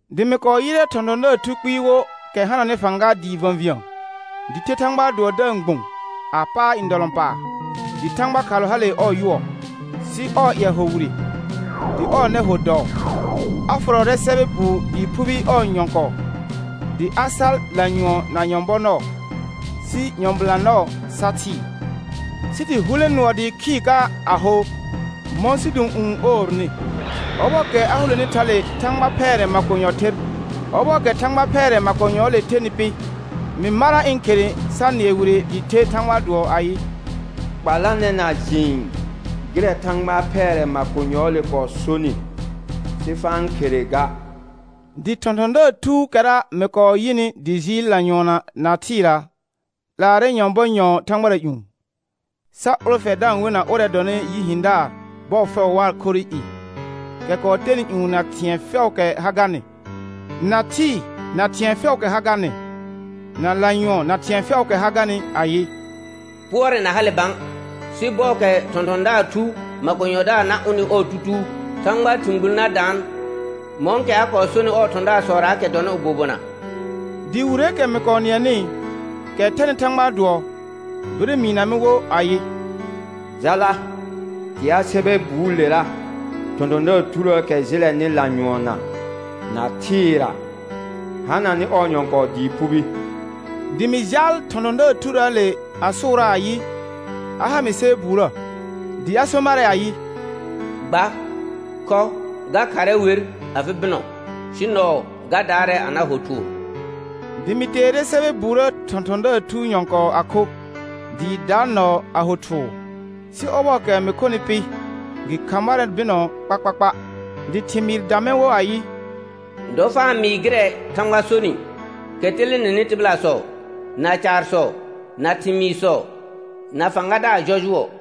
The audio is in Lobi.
Dɩ mɩ kɔɔ yɩrɛ thɔ̃thɔ̃daar thu kpɩɩ wo kɛ hananɩ fãga dɩɩ və̃vĩə, dɩ the Thãgbaa dʋɔ da-n gbũ a paar ndɔlɔ̃paar, dɩ thãgba khalʋ hale ɔɔ yʋɔ, sɩ ɔɔ ƴɛ hor wire, dɩ ɔɔ nɛ ho dɔɔ. A fʋrɔrɛ sɛbɛ buu dɩɩ phubi ɔɔ nyɔ̃kɔɔ, dɩ a sar lanyʋɔn na nyɔ̃bɔ nɔɔ, sɩ nyɔ̃bɩlã nɔɔ sa thɩɩ, sɩ dɩ hulẽ nʋɔ dɩɩ khɩɩr ka a ho mɔ̃ sidũ'ũu n oornɩ. Ɔbɔɔkɛ a huleni thale thãgba phɛɛrɛ makonyɔ ther. Ɔbɔɔkɛ thãgba phɛɛrɛ makonyɔɔle thenɩ pɩ, mɩ marra ɩ̃ khere sa nɩɛ wire dɩɩ the Thãgbaa dʋɔ ayɩ: Kpalanɛ na jɩɩn gɩrɛ thãgba phɛɛrɛ makonyɔɔle kɔɔ sonɩ, sɩ fa-n khere ga. Dɩ thɔ̃thɔ̃daar thuukɛra mɩ kɔɔ yɩnɩ dɩ jɩɩl lanyʋɔnna na thɩɩra, 'laarɛ nyɔ̃bɔ nyɔ̃ɔ thãgbara ƴũ, sa ʋlfɛ da-n wena ʋrɛ dɔnɩ Yi hɩ̃daar bɔɔ fɛʋ waa khorrɩ i, kɛ kɔɔ tenɩ ƴũ na thɩ̃ɛ fɛʋʋkɛ ha garnɩ, na thɩɩ na thɩ̃ɛ fɛʋʋkɛ ha garnɩ, na lanyʋɔn na thɩ̃ɛ fɛʋʋkɛ ha garnɩ ayɩ: Pʋɔrɛ na hale bã; sɩ bɔɔkɛ thɔ̃thɔ̃daar thu makonyɔdaar na ʋnɩ ɔɔ tutuu, Thãgbaa thɩ̃ gbul na daan, mɔ̃kɛ a kɔɔ sonɩ ɔɔ thɔ̃daarsɔraakɛ dɔnɩ bobona. Dɩ wireekɛ mɩ kɔɔ nɩɛnɩ, kɛ thɛnɩ Thãgbaa dʋɔ, bire mɩɩna mɩ wo ayɩ: Jala, tea sɛbɛ buulera thɔ̃thɔ̃daar thurəəkɛ jɩlɛnɩ lanyʋɔnna na thɩɩra hananɩ ɔɔ nyɔ̃kɔɔ dɩɩ phubi. Dɩ mɩ jaal thɔ̃thɔ̃daar thurəəle a sʋʋraa ayɩ, a ha mɩ sɛbɛ buurə. Dɩ a so marɛ ayɩ: Gba, khɔ. Ga kharrɛ wer afɩ bɩnɔ, sɩ nɔɔ ga daarɛ a na ho thʋʋr. Dɩ mɩ teere sɛbɛ buurə thɔ̃thɔ̃daar thuu nyɔ̃kɔɔ a kho, dɩɩ daar nɔɔ a ho thʋʋr, sɩ ɔbɔɔkɛ mɩ khonɩ pɩ, gɩ kha marɛ bɩnɔ kpakpakpa. Dɩ thɩmɩɩr dã mɛr wo ayɩ: Dɔ fa n mɩɩ gɩrɛ Thãgba sonɩ, kɛ telenenɩ tɩbɩlasɔ, na caarsɔ, na thɩmɩɩrsɔ, na fãgadaar jɔjʋɔ.